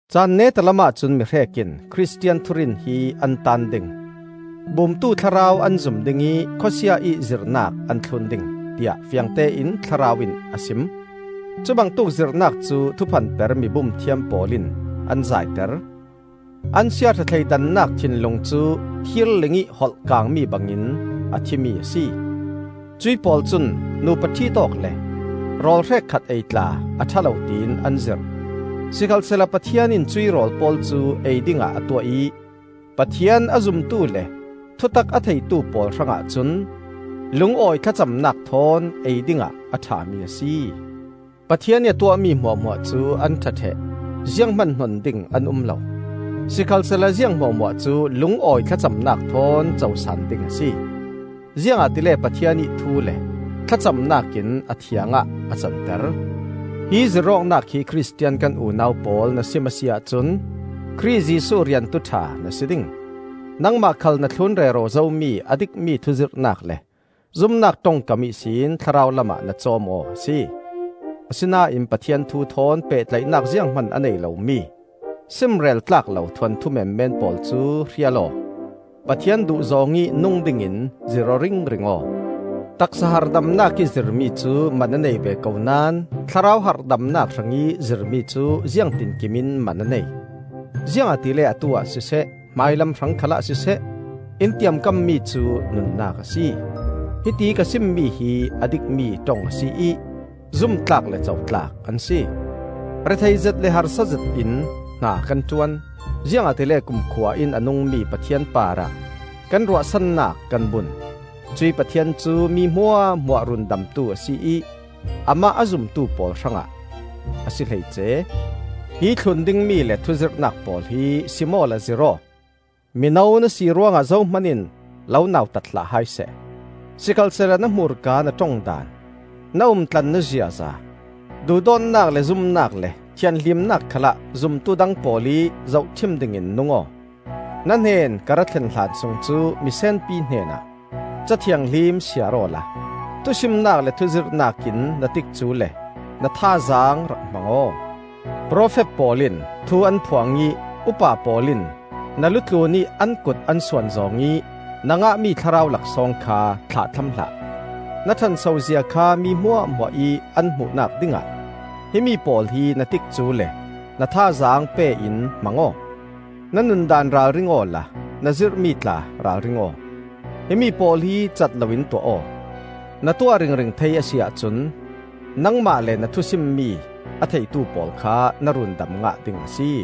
Caan neta lamah cun mihrek in Khristian thurin hi an taan ding; bumtu thlarau an zum ding ih khawsia ih zirhnak an thlun ding, tiah fiangtein Thlarau in a sim. Cubangtuk zirhnak cu thuphanper mibum thiam pawl in an zaiter. An siaṭha thleidannak thinlung cu thirling ih holh kangmi bangin a thimi a si. Cuih pawl cun nupa ṭhit awk le rawl hrekkhat ei tla a ṭha lo tiin an zirh. Sikhalsehla Pathian in cuih rawl pawl cu ei dingah a tuah ih Pathian a zumtu le thutak a theitu pawl hrangah cun lungawi thlacamnak thawn ei dingah a ṭhami a si. Pathian ih a tuahmi hmuahhmuah cu an ṭha ṭheh; zianghman hnon ding an um lo. Sikhalsehla ziang hmuahhmuah cu lungawi thlacamnak thawn cosaan ding a si; ziangahtile Pathian ih thu le thlacamnak in a thiang ah a canter. Hi zirh awknak hi Khristian kan unau pawl na sim a si ahcun Khrih Jesuh riantu ṭha na si ding. Nangmah khal na thlun rero zomi a dikmi thuzirhnak le zumnak ṭongkam ihsin thlarau lamah na cawm aw a si. Asinain Pathian thu thawn pehtlaihnak zianghman a nei lomi simrel tlak lo thuanthu menmen pawl cu hrial aw. Pathian duhzawng ih nung dingin zirh-aw ringring aw. Taksa harhdamnak ih zirmi cu man a nei ve ko naón thlarau harhdamnak hrangih zirmi cu ziangtinkim in man a nei. Ziangahtile atu-ah siseh, hmailam hrang khalah siseh, in tiamkammi cu nunnak a si. Hiti ka simmi hi a dikmi ṭong a si ih zumtlak le cotlak an si. Rethei zet le harsa zetin hna kan ṭuan; ziangahtile kumkhua in a nungmi Pathian parah kan ruahsannak kan bun. Cuih Pathian cu mi hmuahhmuah Rundamtu a si ih amah a zumtu pawl hrangah a si hleice. Hi thlun dingmi le thuzirhnak pawl hi sim awla zirh aw. Mino na si ruangah zohman in lo nautat hlah hai seh. Sikhalsehla na hmurka na ṭong daan, na umtlan na ziaza, duhdawtnak le zumnak le thianhlimnak khalah zumtu dang pawl ih zohṭhim dingin nung aw. Na hnen ka ra thlen hlan sung cu misenpi hnenah Ca Thianghlim siar awla, thusimnak le thuzirhnak in na tikcu le na thazaang rak hmang aw. Profet pawl in thu an phuang ih upa pawl in na lu tlunih an kut an suan zawng ih na ngahmi thlarau laksawng kha thlahthlam hlah. Na ṭhanso zia kha mi hmuahhmuah ih an hmuhnak dingah himi pawl hi na tikcu le na thazaang pe in hmang aw. Na nundaan ralring awla na zirhmi tla ralring aw. Himi pawl hi cat loin tuah aw. Na tuah ringring thei a si ahcun nangmah le na thusimmi a theitu pawl kha na rundam ngah ding a si.